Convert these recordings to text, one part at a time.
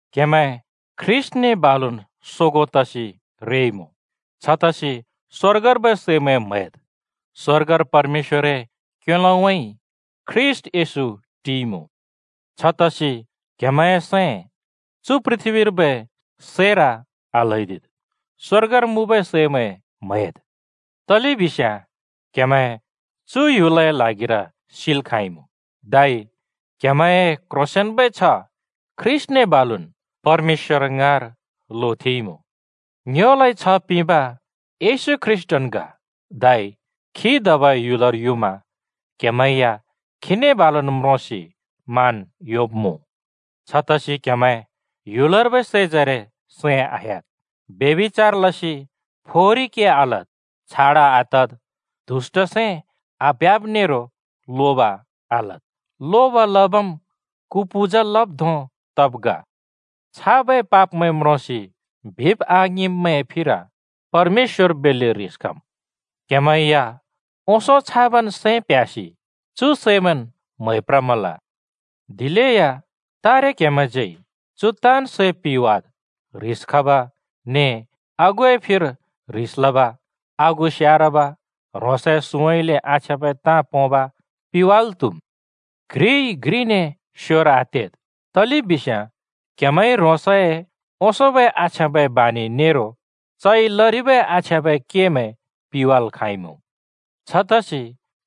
क्‍हेमैं ख्रीष्‍टने बालुन् सोगों तसि रेइमुँ! छतसि स्‍वर्गर्बै सैमैं म्हैद्। स्‍वर्गर परमेश्‍वरए क्‍योलोउँइँ ख्रीष्‍ट येशू टिइमुँ। छतसि क्‍हेमैंए सैं चु पृथ्‍बीर्बै सैर आल्हैदिद्, स्‍वर्गर मुँबै सैमैं म्हैद्। तलेबिस्याँ क्‍हेमैं चु ह्‍युलए ल्हागिर सिल् खाँइमुँ, धै क्हेमैंए क्ह्रोंसेंन्बै छ्ह ख्रीष्‍टने बालुन् परमेश्‍वर ङाँर लोथेंइमुँ। ङ्योलाइ छ्ह पिंब येशू ख्रीष्‍ट ग, धै खी धबै ह्‍युलर युमा क्हेमैं या खीने बालुन् म्रोंसि मान योंब्मुँ। छतसि क्‍हेमैं ह्‍युलर्बै सैजरे सैं आह्‍याद्: फ्रें क्ल्योंब नेरो रण्डिबाजी लसि फोहोरी के आलद्, छाडा आतद्, दुष्‍ट सैं आप्ह्‍याब नेरो लोब आलद्। लोब लबम् कु पूजा लब् धों तब् ग। छाबै पापमैं म्रोंसि बिब् आङिंब्मैंए फिर परमेश्‍वर बेल्‍ले ह्रिस खम्। क्‍हेमैं या ओंसों छाबन् सैं प्ह्‍यासि चु सैंमैंन् म्है प्रमल। दिलेया तारे क्‍हेमैंज्यै चु ताँन् सै पिवाद्: ह्रिस खब ने आगुए फिर ह्रिस लब, आगु स्यारब, ह्रोंसए सुँउँइँले आछ्याँबै ताँ पोंब पिवाल् त्‍हुम्। घ्रिइ घ्रिने स्‍योर आतेद्, तलेबिस्याँ क्‍हेमैंइ ह्रोंसए ओंसोंबै आछ्याँबै बानि नेरो चइ लरिबै आछ्याँबै केमैं पिवाल् खाँइमुँ। छतसि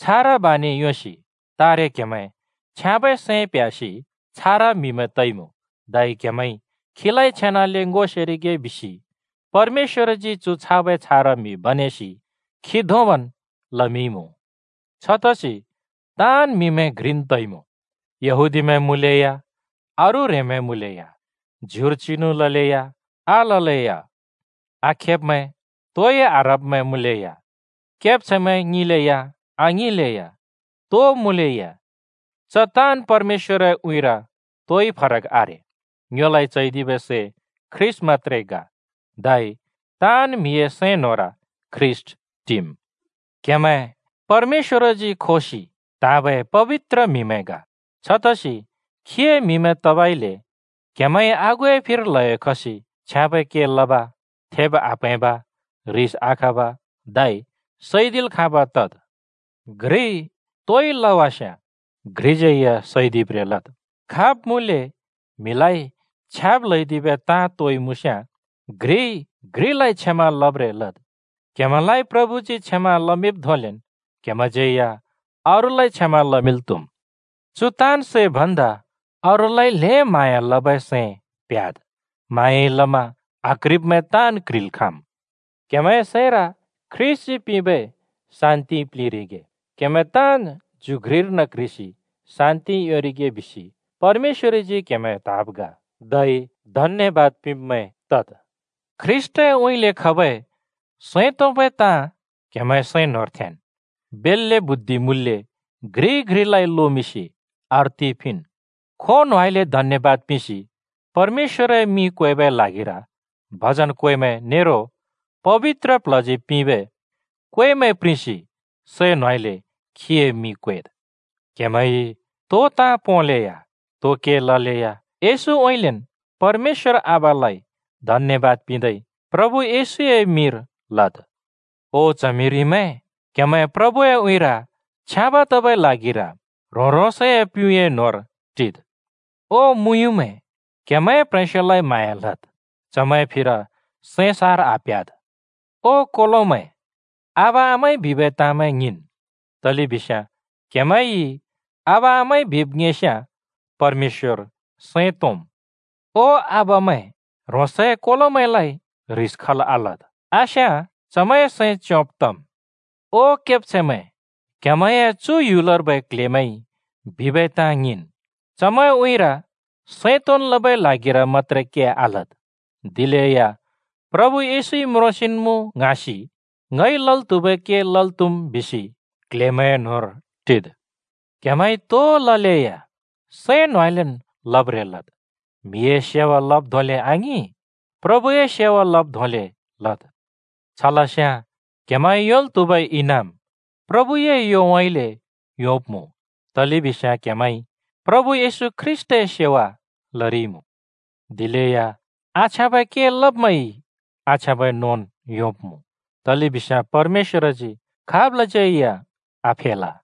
छारा बानि योंसि तारे क्हेमैंइ छ्याँबै सैं प्ह्‍यासि छारा म्‍हिमैं तइमुँ। धै क्हेमैंइ खीलाइ छेनाले ङो सेरिगे बिसि परमेश्‍वरजी चु छाबै छारा म्हि बनेसि खी धोंबन् लमिंरिइमुँ। छतसि ताँन् म्‍हिमैं घ्रिन् तइमुँ। यहूदीमैं मुँलेया, अरू ह्रेंमैं मुँलेया, ज्युर चिनु ललेया आललेया, आखेब्‍मैं, तोइ आह्रब्मैं मुँलेया, केब्छैंमैं ङिंलेया आङिंलेया, तो मुँलेया, च ताँन् परमेश्‍वरए उँइँर तोइ फरक आरे। ङ्योलाइ चैदिबै सै ख्रीष्‍ट मत्‍त्रे ग, धै ताँन् म्‍हिए सैं न्‍होंर ख्रीष्‍ट टिम्। क्हेमैं परमेश्‍वरजी खोबै त्हाँबै पबित्र म्हिमैं ग। छतसि खीए म्हिमैं तबइले क्‍हेमैंइ आगुए फिर ल्‍हयो खसि छ्याँबै के लब, थेब् आप्‍हैंब, ह्रिस आखब, धै सैदिल् खाँब तद्। घ्रिइ तोइ लवास्याँ घ्रिज्यै या सैदिब्रें लद्, खाब् मुँले म्हिलाइ छ्याब् ल्हैदिबै ताँ तोइ मुँस्याँ घ्रिइ घ्रिलाइ क्षमा लब्रें लद्। क्‍हेमैंलाइ प्रभुजी क्षमा लमिंब् धोंलेन क्‍हेमैंज्‍यै या अरूलाइ क्षमा लमिंल् त्हुम्। चु ताँन् सै भन्दा अरूलाइ ल्हें म्हाँया लबै सैं प्‍ह्‍याद्। म्हाँयाइ लमा आक्ह्रिब्मैं ताँन् क्ह्रिल् खाँम्। क्‍हेमैंए सैंर ख्रीष्‍टजी पिंबै शान्तिइ प्लिंरिगे। क्हेमैं ताँन् ज्यु घ्रिर्न क्ह्रिसि शान्ति योंरिगे बिसि परमेश्‍वरजी क्‍हेमैं त्‍हाँब् ग। धै धन्‍यबाद पिंब्‍मैं तद्। ख्रीष्‍टउँइँले खबै सैं तोंबै ताँ क्‍हेमैंए सैं न्होंर थेंन्। बेल्‍ले बुद्धि मुँल्‍ले घ्रिइ घ्रिलाइ लोमिंसि अर्थि पिंन्। खों न्होंउँइँले धन्यबाद पिंसि परमेश्‍वरए मिं क्वेबै ल्हागिर भजन, क्वेमैं नेरो पबित्र प्ल्हजी पिंबै क्वेमैं प्रिंसि सैं न्होंउँइँले खीए मिं क्वेद्। क्हेमैंइ तो ताँ पोंलेया, तो के ललेया, येशूउँइँलेन् परमेश्‍वर आबालाइ धन्यबाद पिंदै प्रभु येशूए मिंर लद्। ओ च्हमिरिमैं, क्हेमैं प्रभुए उँइँर छ्याँब तबै ल्हागिर ह्रों-ह्रोंसए प्‍युँए न्होंर टिद्। ओ मुँयुँमैं, क्‍हेमैंए प्‍ह्रेंस्‍योलाइ म्हाँया लद्, चमैंए फिर सैं सार् आप्‍ह्‍याद्। ओ कोलोमैं, आबा-आमाइ बिबै तामैं ङिंन्, तलेबिस्याँ क्हेमैंइ आबा-आमाइ बिब ङिंस्याँ परमेश्‍वर सैं तोंम्। ओ आबामैं, ह्रोंसए कोलोमैंलाइ ह्रिस खल् आलद्। आस्याँ चमैंए सैं च्योंब् तम्। ओ केब्छैंमैं, क्‍हेमैंए चु ह्‍युलर्बै क्ल्हेमैंइ बिबै ताँ ङिंन्। चमैंए उँइँर सैं तोंन् लबै ल्हागिर मत्‍त्रे के आलद्, दिलेया प्रभु येशूइ म्रोंसिन्मुँ ङ्हाँसि “ङइ लल् त्हुबै के लल् त्हुम्” बिसि क्ल्हेमैंए न्होंर टिद्। क्‍हेमैंइ तो ललेया सैं न्होंउँइँलेन् लब्रें लद्। म्‍हिए सेवा लब् धोंले आङिं, प्रभुए सेवा लब् धोंले लद्। छ लस्याँ क्‍हेमैंइ योंल् त्हुबै इनाम प्रभुए योउँइँले योंब्मुँ, तलेबिस्याँ क्‍हेमैंइ प्रभु ख्रीष्‍टए सेवा लरिइमुँ। दिलेया आछ्याँबै के लब्मैंइ आछ्याँबै नोंन् योंब्मुँ, तलेबिस्याँ परमेश्‍वरजी खाबलाज्यै या आफेल।